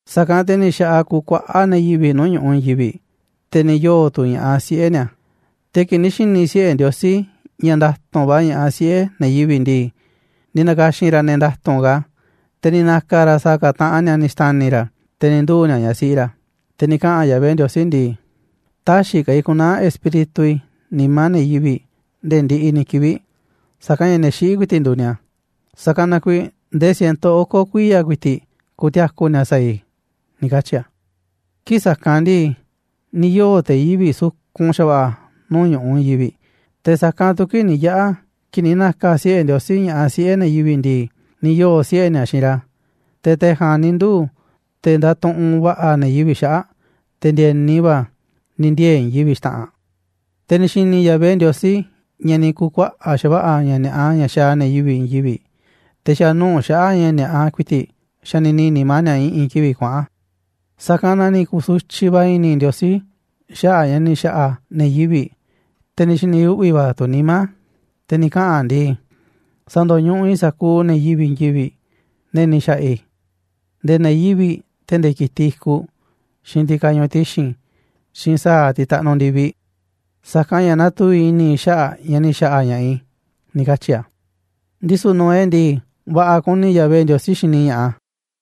Sa̱kanꞌ te̱ ni̱ xa̱ꞌaꞌ kukuaꞌá ne̱ yivi̱ꞌ nuu̱ꞌ ñu̱ꞌuꞌ i̱i̱n yivi̱ꞌ, te̱ ni̱ yoo̱ tu̱ ña̱ꞌaꞌ siꞌe̱ ni̱a̱. Te̱ kii̱ꞌ ni̱ xi̱ni̱ siꞌe̱ Ndiosí ña̱ nda̱tu̱nꞌ va̱ ña̱ꞌaꞌ siꞌe̱ ne̱ yivi̱ꞌ ndii, ni̱ na̱ka̱xi̱n ra̱ ne̱ nda̱tu̱nꞌ ka̱, te̱ ni̱ na̱ka̱ ra̱ sa̱a̱ ka̱ taꞌan ni̱a̱ ni̱ xta̱ni̱ ra̱, te̱ ni̱ nduu̱ ni̱a̱ ñaꞌ siꞌi ra̱. Te̱ ni̱ kaꞌa̱n Yahvé Ndiosí ndii: ―Tä̱xi̱ ka̱ i̱ ku̱naa̱ Espíritu i̱ nimá ne̱ yivi̱ꞌ nde̱e̱ ndiꞌiꞌ ni̱ kivi̱ꞌ, sa̱kanꞌ ña̱ ne̱ xiꞌí ku̱i̱ti̱ꞌ nduuꞌ ni̱a̱. Sa̱kanꞌ na kuiiꞌ ndee ciento oko̱ kuiya̱ ku̱i̱ti̱ꞌ ku̱ti̱a̱ku̱ ni̱a̱ sa̱a̱ i̱ ―ni̱ katyi̱ a̱. Kii̱ꞌ sa̱kanꞌ ndii, ni̱ yoo̱ te̱ yivi̱ꞌ sukun xa̱va̱ꞌa̱ nuu̱ꞌ ñu̱ꞌuꞌ i̱i̱n yivi̱ꞌ, te̱ sa̱kanꞌ tu̱ kii̱ꞌ ni̱ yaꞌa̱ kii̱ꞌ ni̱ na̱ka̱ siꞌe̱ Ndiosí ña̱ꞌaꞌ siꞌe̱ ne̱ yivi̱ꞌ ndii, ni̱ yoo̱ siꞌe̱ ni̱a̱ xiinꞌ ra̱. Te̱ te̱ ja̱a̱nꞌ ni̱ nduu̱ te̱ ndatuꞌunꞌ va̱ꞌa̱ ne̱ yivi̱ꞌ xaꞌa̱ꞌ, te̱ ndi̱e̱ni va̱, ni̱ ndiee̱ i̱i̱n yivi̱ꞌ xta̱ꞌanꞌ. Te̱ ni̱ xi̱ni̱ Yahvé Ndiosí ña̱ ni̱ ku̱kuaꞌa̱ꞌ xa̱va̱ꞌa̱ ña̱ ni̱a̱ꞌa ña̱ xaaꞌ ne̱ yivi̱ꞌ i̱i̱n yivi̱ꞌ, te̱ xa̱ nuu̱ꞌ xaꞌa̱ꞌ ña̱ ni̱a̱ꞌa ku̱i̱ti̱ꞌ xanini nimá ni̱a̱ i̱ꞌi̱n kivi̱ꞌ kuaꞌa̱n. Sa̱kanꞌ na ni̱ ku̱su̱tyiꞌ va̱ i̱ni̱ Ndiosí xaꞌa̱ꞌ a̱ ña̱ ni̱ xa̱ꞌa̱ a̱ ne̱ yivi̱ꞌ, te̱ ni̱ xi̱ni̱ uꞌvi̱ va̱ tu̱ nimá a̱. Te̱ ni̱ kaꞌa̱n a̱ ndii: ―Sa̱ndo̱ñuꞌuꞌ i̱ sa̱kuuꞌ ne̱ yivi̱ꞌ i̱i̱n yivi̱ꞌ, ne̱ ni̱ xa̱ꞌa̱ i̱, nde̱e̱ ne̱ yivi̱ꞌ, te̱ nde̱e̱ ki̱tiꞌ i̱kuꞌ, xiinꞌ tiꞌ kañuuꞌ ti̱xi̱n, xiinꞌ sa̱a̱ tiꞌ taꞌnuꞌ ndi̱viꞌ, sa̱kanꞌ ña̱ natuvi̱ꞌ i̱ni̱ i̱ xaꞌa̱ꞌ a̱ ña̱ ni̱ xa̱ꞌa̱ ña̱ꞌaꞌ i̱ ―ni̱ katyi̱ a̱. Ndisu̱ Noé ndii, va̱ꞌa̱ kuni Yahvé Ndiosí xini ña̱ꞌaꞌ a̱.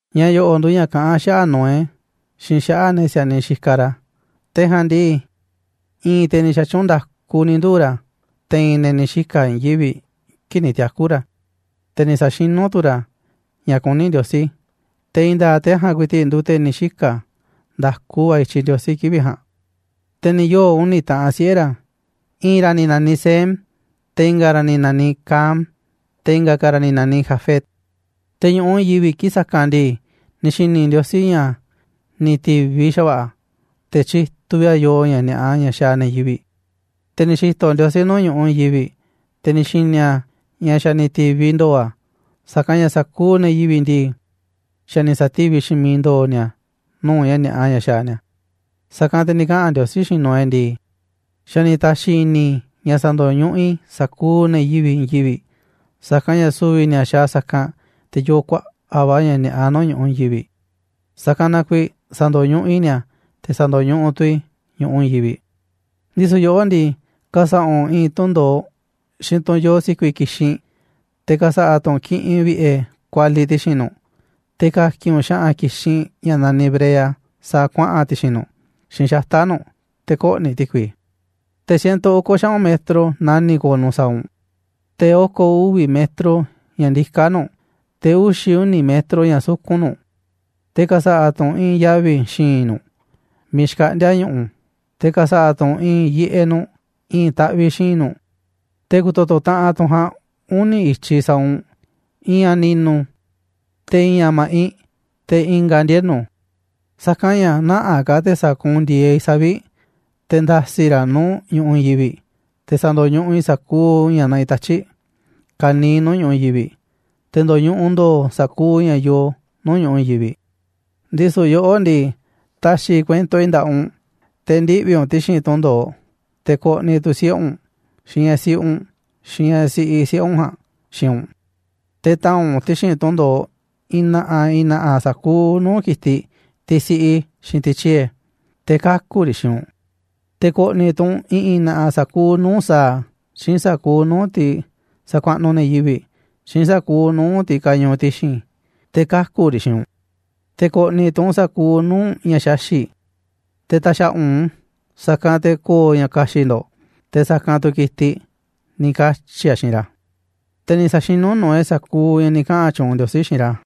Ña̱ yo̱ꞌo̱ nduuꞌ ña̱ kaꞌán xaꞌa̱ꞌ Noé, xiinꞌ xaꞌa̱ꞌ ne̱ si̱a̱niꞌ xikaꞌ ra̱. Te̱ ja̱a̱nꞌ ndii, i̱i̱n te̱ ni̱ xa̱tyuunꞌ nda̱ku ni̱ nduu̱ ra̱ te̱i̱n ne̱ ni̱ xika̱ i̱i̱n yivi̱ꞌ kii̱ꞌ ni̱ tiaku̱ ra̱, te̱ ni̱ sa̱xinú tu̱ ra̱ ña̱ kuní Ndiosí, te̱ i̱i̱n nda̱a̱ꞌ te̱ ja̱a̱nꞌ ku̱i̱ti̱ꞌ nduuꞌ te̱ ni̱ xika̱ nda̱ku va̱ i̱tyiꞌ Ndiosí kivi̱ꞌ ja̱a̱nꞌ. Te̱ ni̱ yoo̱ uni̱ taꞌanꞌ siꞌe̱ ra̱: I̱i̱n ra̱ ni̱ naniꞌ Sem, te̱ i̱nga̱ ra̱ ni̱ naniꞌ Cam, te̱ i̱nga̱ ka̱ ra̱ ni̱ na̱niꞌ Jafet. Te̱ ñu̱ꞌuꞌ i̱i̱n yivi̱ꞌ kii̱ꞌ sa̱kanꞌ ndii, ni̱ xi̱ni̱ Ndiosí ña̱ ni̱ ti̱viꞌ xa̱va̱ꞌa̱ a̱, te̱ tyituꞌ vi̱ꞌ a̱ yoo ña̱ ni̱a̱ꞌa ña̱ xaaꞌ ne̱ yivi̱ꞌ. Te̱ ni̱ xi̱to̱ Ndiosí nuu̱ꞌ ñu̱ꞌuꞌ i̱i̱n yivi̱ꞌ, te̱ ni̱ xi̱ni̱ a̱ ña̱ xa̱ ni̱ ti̱viꞌ ndo̱o̱ a̱, sa̱kanꞌ ña̱ sa̱kuuꞌ ne̱ yivi̱ꞌ ndii, xa̱ ni̱ sa̱tíviꞌ xiinꞌ miiꞌ ndo̱o̱ ni̱a̱ nuu̱ꞌ ña̱ ni̱a̱ꞌa ña̱ xaaꞌ ni̱a̱. Sa̱kanꞌ te̱ ni̱ kaꞌa̱n Ndiosí xiinꞌ Noé ndii: ―Xa̱ ni̱ ta̱xi̱ i̱ni̱ i̱ ña̱ sa̱ndo̱ñuꞌuꞌ i̱ sa̱kuuꞌ ne̱ yivi̱ꞌ i̱i̱n yivi̱ꞌ, sa̱kanꞌ ña̱ su̱vi̱ ni̱a̱ xaaꞌ sa̱kanꞌ, te̱ yoo kuaꞌa̱ꞌ va̱ ña̱ ni̱a̱ꞌa nuu̱ꞌ ñu̱ꞌuꞌ i̱i̱n yivi̱ꞌ, sa̱kanꞌ na kuiiꞌ sa̱ndo̱ñuꞌuꞌ i̱ ni̱a̱, te̱ sa̱ndo̱ñuꞌuꞌ tu̱ i̱ ñu̱ꞌuꞌ i̱i̱n yivi̱ꞌ. Ndisu̱ yoꞌó ndii, ka̱sa̱ꞌa̱ u̱nꞌ i̱i̱n tunꞌ ndo̱oꞌ xiinꞌ tunꞌ yoo si̱ku̱i̱ ki̱xinꞌ, te̱ ka̱sa̱ꞌa̱ tu̱ u̱nꞌ kiꞌinꞌ vi̱ꞌe̱ kualiꞌ ti̱xi̱n nu̱ꞌ, te̱ ka̱ki̱n u̱nꞌ xa̱ꞌa̱n ki̱xinꞌ ña̱ naniꞌ brea sa̱a̱ kuaꞌa̱n ti̱xi̱n nu̱ꞌ, xiinꞌ xata̱ꞌ nu̱ꞌ, te̱ kö̱ꞌni̱ ti̱kui. Te̱ ciento oko̱ xaꞌu̱n metro nani̱ꞌ ko̱o̱ nu̱ꞌ sa̱a̱ u̱nꞌ, te̱ oko̱ uvi̱ metro ña̱ ndiká nu̱ꞌ, te̱ uxi̱ uni̱ metro ña̱ sukun nu̱ꞌ. Te̱ ka̱sa̱ꞌa̱ tu̱ u̱nꞌ i̱i̱n yavi̱ xi̱i̱nꞌ nu̱ꞌ miiꞌ xkaꞌndi̱a̱ ñu̱ꞌu̱, te̱ ka̱sa̱ꞌa̱ tu̱ u̱nꞌ i̱i̱n yiꞌeꞌ nu̱ꞌ i̱i̱n taꞌviꞌ xi̱i̱nꞌ nu̱ꞌ, te̱ ku̱to̱to̱ taꞌanꞌ tunꞌ ja̱a̱nꞌ uni̱ i̱tyiꞌ sa̱a̱ u̱nꞌ, i̱i̱n a̱ ni̱nu̱, te̱ i̱i̱n a̱ ma̱ꞌinꞌ, te̱ i̱nga̱ a̱ ndienu̱. Sa̱kanꞌ ña̱ nä̱ꞌanꞌ ka̱ te̱ sa̱kuunꞌ ndi̱e̱eꞌ i̱ savi̱ꞌ te̱ nda̱si̱ raꞌ nuu̱ꞌ ñu̱ꞌuꞌ i̱i̱n yivi̱ꞌ, te̱ sa̱ndo̱ñuꞌuꞌ i̱ sa̱kuuꞌ ña̱ naꞌiꞌ tatyi̱ꞌ ka̱niiꞌ nuu̱ꞌ ñu̱ꞌuꞌ i̱i̱n yivi̱ꞌ. Te̱ ndo̱ñuꞌuꞌ ndo̱o̱ sa̱kuuꞌ ña̱ yoo nuu̱ꞌ ñu̱ꞌuꞌ i̱i̱n yivi̱ꞌ. 'Ndisu̱ yoꞌó ndii, ta̱xi̱ i̱ kuento i̱ nda̱ꞌaꞌ u̱nꞌ, te̱ ndiꞌvi̱ u̱nꞌ ti̱xi̱n tunꞌ ndo̱oꞌ, te̱ ko̱ꞌni̱ tu̱ siꞌe̱ u̱nꞌ, xiinꞌ ñaꞌ siꞌi u̱nꞌ, xiinꞌ ñaꞌ siꞌiꞌ siꞌe̱ u̱nꞌ ja̱a̱nꞌ xiinꞌ u̱nꞌ. Te̱ ta̱a̱nꞌ u̱nꞌ ti̱xi̱n tunꞌ ndo̱oꞌ i̱i̱n na̱ꞌa̱ i̱i̱n na̱ꞌa̱ sa̱kuuꞌ nuu̱ꞌ ki̱tiꞌ, tiꞌ siꞌi, xiinꞌ tiꞌ tyie̱, te̱ kaku̱ riꞌ xiinꞌ u̱nꞌ. Te̱ ko̱ꞌni̱ tu̱ u̱nꞌ i̱ꞌi̱n na̱ꞌa̱ sa̱kuuꞌ nuu̱ꞌ sa̱a̱, xiinꞌ sa̱kuuꞌ nuu̱ꞌ tiꞌ sakuaꞌnuꞌ ne̱ yivi̱ꞌ, xiinꞌ sa̱kuuꞌ nuu̱ꞌ tiꞌ kañuuꞌ ti̱xi̱n, te̱ kaku̱ riꞌ xiinꞌ u̱nꞌ. Te̱ ko̱ꞌni̱ tu̱ u̱nꞌ sa̱kuuꞌ nuu̱ꞌ ña̱ xaxi̱ꞌ, te̱ ta̱xa̱ꞌa̱ u̱nꞌ u̱n, sa̱kanꞌ te̱ ko̱o̱ ña̱ ka̱xi̱ꞌ ndo̱ꞌ, te̱ sa̱kanꞌ tu̱ ki̱tiꞌ ―ni̱ katyi̱ a̱ xiinꞌ ra̱. Te̱ ni̱ sa̱xinú Noé sa̱kuuꞌ ña̱ ni̱ kaꞌa̱n tyuunꞌ Ndiosí xiinꞌ ra̱.